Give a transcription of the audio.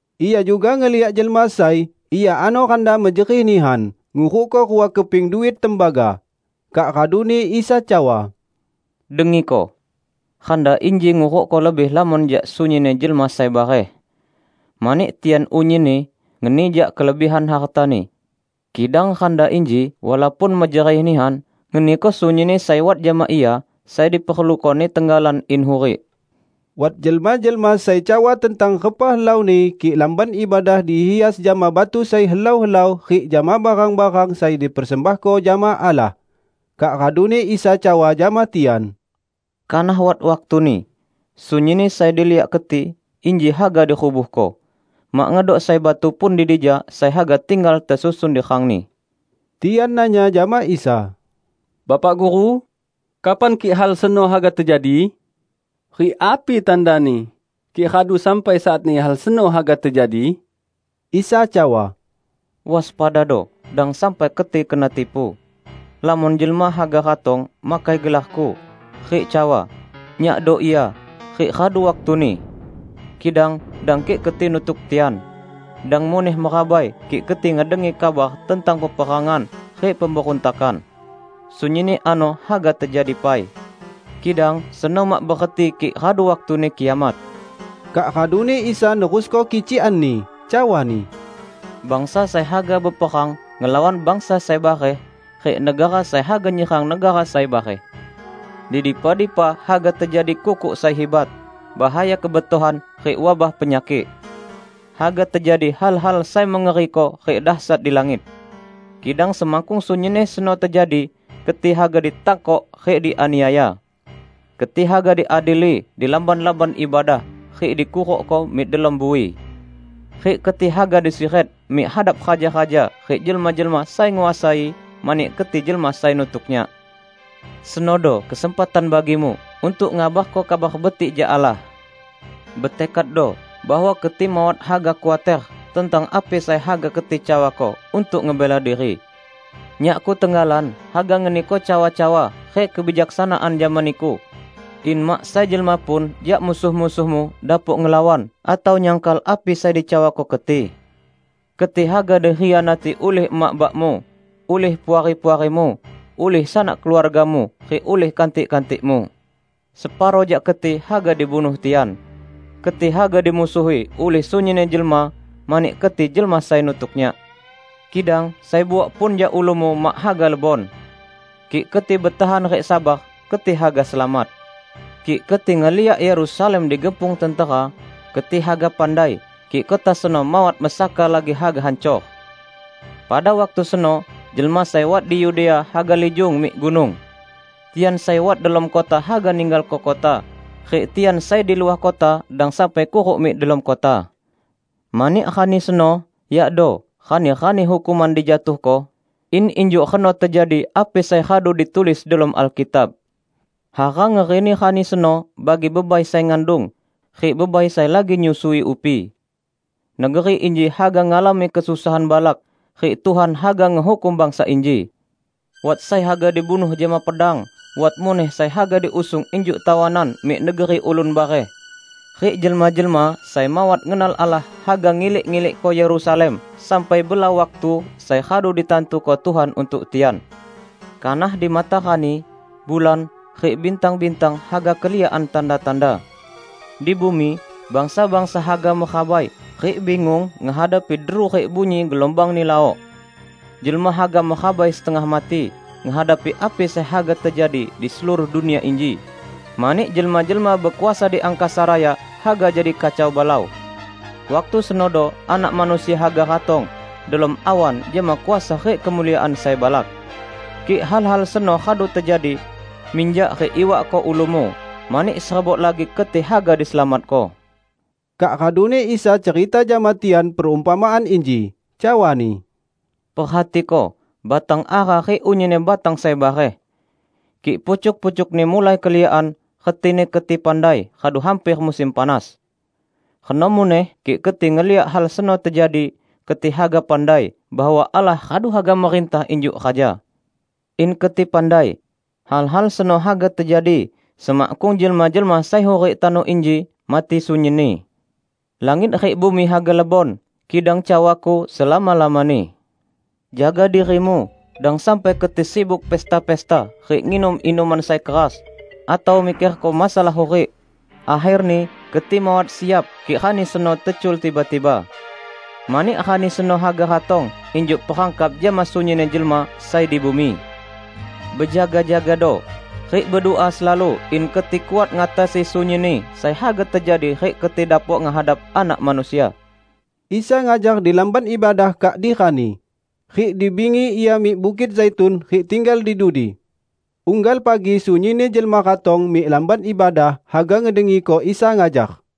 Ia juga ngeliak jelma sai, ia ano randa mejerih nihan, ngurukko rua keping duit tembaga. Kak raduni Isa cawa, "Dengiko: randa inji ngurukko lebih lamon jak sunyinni jelma sai bareh. Mani tian unyinni ngeni jak kelebihan hartani. Kidang randa inji, walaupun mejerih nihan, ngeniko sunyinni sai wat jama ia sai diperlukoni tenggalan in hurik." Wat jelma-jelma sai cawa tentang repa helauni kik Lamban Ibadah dihias jama batu sai helau-helau rik jama barang-barang sai dipersembahko jama Allah. Kak raduni Isa cawa jama tian, "Kanah wat waktuni, sunyinni sai diliak keti inji haga dirubuhko; mak ngedok sai batu pun di dija sai haga tinggal tesusun di rangni!" Tian nanya jama Isa, "Bapak Guru, kapan kik hal seno haga tejadi? Rik api tandani kik radu sampai saatni hal seno haga tejadi?" Isa cawa, "Waspadado, dang sampai keti kena tipu. Lamon jelma haga ratong makai gelar-Ku, rik cawa, 'Nyakdo Ia!' rik 'Radu waktuni.' Kidang dang kik keti nutuk tian. Dang muneh merabai kik keti ngedengi kabar tentang peperangan rik pemberuntakan. Sunyinni ano haga tejadi pai. Kidang seno mak bereti kik radu waktuni kiamat." Kak raduni Isa nerusko kicikan-Ni, cawa-Ni, "Bangsa sai haga beperang ngelawan bangsa sai bareh rik negara sai haga nyerang negara sai bareh. Di dipa-dipa haga tejadi kukuk sai hibat, bahaya kebetohan rik wabah penyakik. Haga tejadi hal-hal sai mengeriko rik dasyat di langit. Kidang semakkung sunyinni seno tejadi, keti haga ditangkok rik dianiaya. Keti haga diadili di lamban-lamban ibadah rik dikurukko mik delom bui. Rik keti haga disiret mik hadap raja-raja rik jelma-jelma sai nguasai mani keti jelma sai nutuk Nyak. Senodo kesempatan bagimu untuk ngabarko Kabar Betik jak Allah. Betekaddo bahwa keti mawat haga khuater tentang api sai haga keti cawako untuk ngebela diri. Nyakku tenggalan haga ngeniko cawa-cawa rik kebijaksanaan jama niku, in mak sai jelma pun jak musuh-musuhmu dapok ngelawan atau nyangkal api sai dicawako keti. Keti haga dikhianati ulih emak bakmu, ulih puari-puarimu, ulih sanak keluargamu rik ulihni kantik-kantikmu. Separo jak keti haga dibunuh tian. Keti haga dimusuhi ulih sunyinni jelma mani keti jelma sai nutuk Nyak. Kidang sai buok pun jak ulumu mak haga lebon. Kik keti betahan rik sabar, keti haga selamat." "Kik keti ngeliak Yerusalem digepung tentera, keti haga pandai kik kota seno mawat mesaka lagi haga hancor. Pada waktu seno jelma sai wat di Yudea haga lijung mik gunung. Tian sai wat delom kota haga ninggalko kota, rik tian sai di luah kota dang sampai kuruk mik delom kota. Mani rani seno yakdo 'Rani-rani Hukuman Dijatuhko', in injuk reno tejadi api sai radu ditulis delom Alkitab. Hara ngerini rani seno bagi bebai sai ngandung, rik bebai sai lagi nyusui upi! Negeri inji haga ngalami kesusahan balak, rik Tuhan haga ngehukum bangsa inji. Wat sai haga dibunuh jama pedang, wat muneh sai haga diusung injuk tawanan mik negeri ulun bareh; rik jelma-jelma sai mawat ngenal Allah haga ngilik-ngilikko Yerusalem sampai bela waktu sai radu ditantuko Tuhan untuk tian." "Kanah di matarani, bulan, rik bintang-bintang haga keliakan tanda-tanda. Di bumi, bangsa-bangsa haga merabai rik bingung ngehadapi deru rik bunyi gelumbangni lawok. Jelma haga merabai setengah mati ngehadapi api sai haga tejadi di seluruh dunia inji, mani jelma-jelma bekuasa di angkasa raya haga jadi kacau balau. Waktu senodo Anak Manusia haga ratong delom awan jama kuasa rik kemuliaan sai balak. Kik hal-hal seno radu tejadi, minjak rik iwakko ulumu, mani serebok lagi keti haga diselamatko." Kak raduni Isa cerita jama tian perumpamaan inji, cawa-Ni, "Perhatiko batang ara rik unyinni batang sai bareh. Kik pucuk-pucukni mulai keliakan, retini keti pandai radu hamper musim panas. Reno muneh kik keti ngeliak hal seno tejadi, keti haga pandai bahwa Allah radu haga merintah injuk Raja. In keti pandai! Hal-hal seno haga tejadi semakkung jelma-jelma sai hurik tano inji mati sunyinni. Langit rik bumi haga lebon, kidang cawa-Ku selama-lamani." "Jaga dirimu, dang sampai keti sibuk pesta-pesta rik nginum inuman sai keras, atau mikerko masalah hurik, akherni keti mawat siap kik rani seno tecul tiba-tiba. Mani Rani seno haga ratong injuk perangkap jama sunyinni jelma sai di bumi. Bejaga-jagado, rik bedua selalu in keti kuat ngatasi sunyinni sai haga tejadi rik keti dapok ngehadap Anak Manusia." Isa ngajar di Lamban Ibadah kak di rani, rik di bingi Ia mik Bukit Zaitun rik tinggal di dudi. Unggal pagi sunyinni jelma ratong mik Lamban Ibadah haga ngedengiko Isa ngajar.